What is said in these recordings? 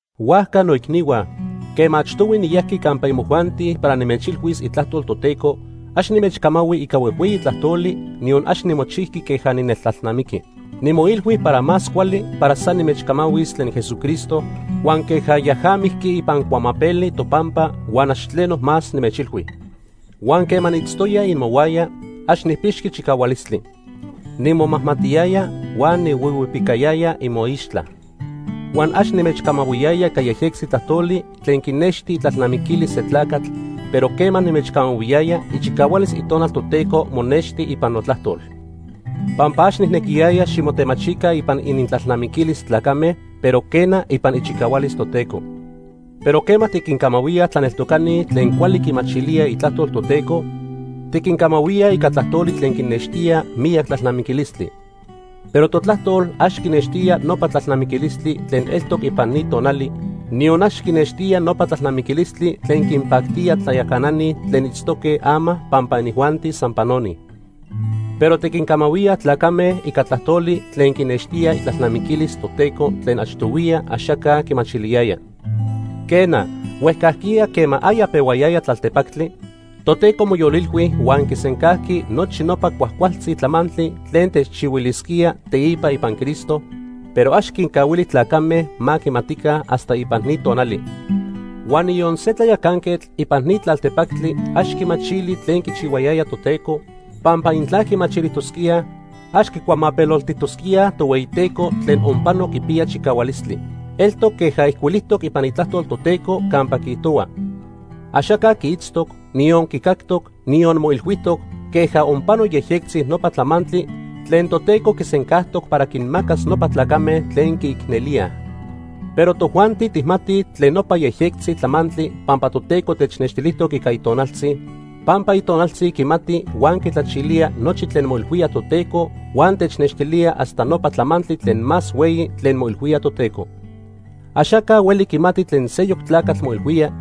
Huajca, noicnihua, quema achtohui niyajqui campa imojuanti para nimechilhuis itlajtol Toteco, ax nimechcamahui ica huejhueyi tlajtoli, niyon ax nimochijqui queja nineltlalnamiqui. Nimoilhui para más cuali para san nimechcamahuis tlen Jesucristo huan queja yaja mijqui ipan cuamapeli topampa huan ax tleno más nimechilhui. Huan quema niitztoya imohuaya, ax nijpixqui chicahualistli. Nimomajmatiyaya huan nihuihuipicayaya imoixtla. Huan ax nimechcamahuiyaya ica yejyectzi tlajtoli tlen quinexti itlalnamiquilis se tlacatl, pero quema nimechcamahuiyaya, ichicahualis Itonal Toteco monexti ipan notlajtol. Pampa ax nijnequiyaya ximotemachica ipan inintlalnamiquilis tlacame, pero quena ipan ichicahualis Toteco. Pero quema tiquincamahuíaj tlaneltocani tlen cuali quimachilíaj Itlajtlol Toteco, tiquincamahuíaj ica tlajtoli tlen quinextía miyac tlalnamiquilistli. Pero totlajtol ax quinextía nopa tlalnamiquilistli tlen eltoc ipan ni tonali, niyon ax quinextía nopa tlalnamiquilistli tlen quinpactía tlayacanani tlen itztoque ama pampa inijuanti san panoni. Pero tiquincamahuíaj tlacame ica tlajtoli tlen quinextía itlalnamiquilis Toteco tlen achtohuiya axaca quimachiliyaya. Quena, huejcajquiya quema aya pehuayaya tlaltepactli, Toteco moyolilhui huan quisencajqui nochi nopa cuajcualtzi tlamantli tlen techchihuilisquía teipa ipan Cristo, pero ax quincahuili tlacame ma quimatica hasta ipan ni tonali. Huan niyon se tlayacanquetl ipan ni tlaltepactli ax quimachili tlen quichihuayaya Toteco, pampa intla quimachilijtosquíaj, ax quicuamapeloltijtosquíaj Tohueyiteco tlen onpano quipiya chicahualistli. Eltoc queja ijcuilijtoc ipan Itlajtol Toteco campa quiijtohua: “Axaca quiitztoc, niyon quicactoc, niyon moilhuijtoc, queja onpano yejyectzi nopa tlamantli tlen Toteco quisencajtoc para quinmacas nopa tlacame tlen quiicnelíaj.” Pero tojuanti tijmatij tlen nopa yejyectzi tlamantli pampa Toteco technextilijtoc ica Itonaltzi, pampa Itonaltzi quimati huan quitlachilía nochi tlen moilhuía Toteco huan technextilía hasta nopa tlamantli tlen más hueyi tlen moilhuía Toteco. Axaca hueli quimati tlen seyoc tlacatl moilhuía,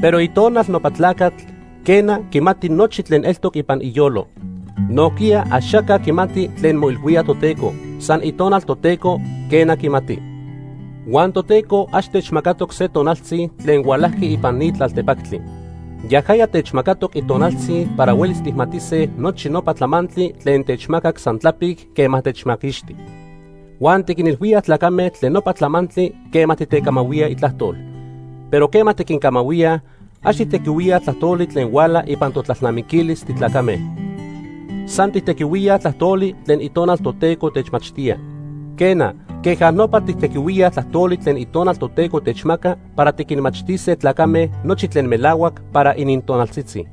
pero itonal nopa tlacatl, quena, quimati nochi tlen eltoc ipan iyolo. Nojquiya axaca quimati tlen moilhuía Toteco, san Itonal Toteco, quena, quimati. Huan Toteco ax techmacatoc se tonaltzi tlen hualajqui ipan ni tlaltepactli. Yajaya techmacatoc Itonaltzi para huelis tijmatise nochi nopa tlamantli tlen techmacac san tlapic quema techmaquixti. Huan tiquinilhuíaj tlacame tlen nopa tlamantli quema titecamahuía itlajtol. Pero quema tiquincamahuíaj, ax tijtequihuíaj tlajtoli tlen huala ipan totlalnamiquilis titlacame, san tijtequihuíaj tlajtoli tlen Itonal Toteco techmachtía. Quena, queja nopa tijtequihuíaj tlajtoli tlen Itonal Toteco techmaca para tiquinmachtise tlacame nochi tlen melahuac para inintonaltzitzi.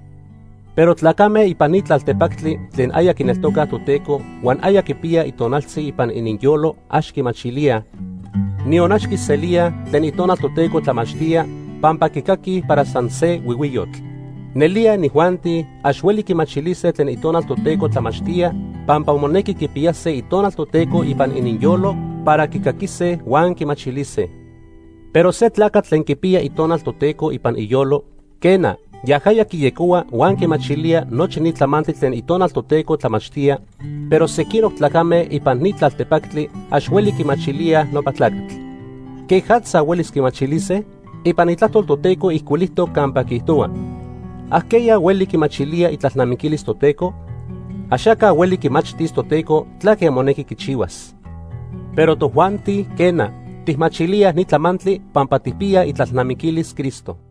Pero tlacame ipan ni tlaltepactli tlen aya quineltocaj Toteco huan aya quipiyaj Itonaltzi ipan ininyolo ax quimachilíaj, niyon ax quiselíaj, tlen Itonal Toteco tlamachtía, pampa quicaquij para san se huihuiyotl. Nelía inijuanti ax hueli quimachilise tlen Itonal Toteco tlamachtía pampa monequi quipiyase Itonal Toteco ipan ininyolo para quicaquise huan quimachilise. Pero se tlacatl tlen quipiya Itonal Toteco ipan iyolo, quena, yajaya quiyecohua huan quimachilía nochi ni tlamantli tlen Itonal Toteco tlamachtía, pero sequinoc tlacame ipan ni tlaltepactli ax hueli quimachilíaj nopa tlacatl. ¿Quejatza huelis quimachilise? Ipan Itlajtol Toteco ijcuilijtoc campa quiijtohua: “¿Ajqueya hueli quimachilía itlalnamiquilis Toteco? Axaca hueli quimachtis Toteco tlaque monequi quichihuas.” Pero tojuanti, quena, tijmachilíaj ni tlamantli pampa tijpiyaj itlalnamiquilis Cristo.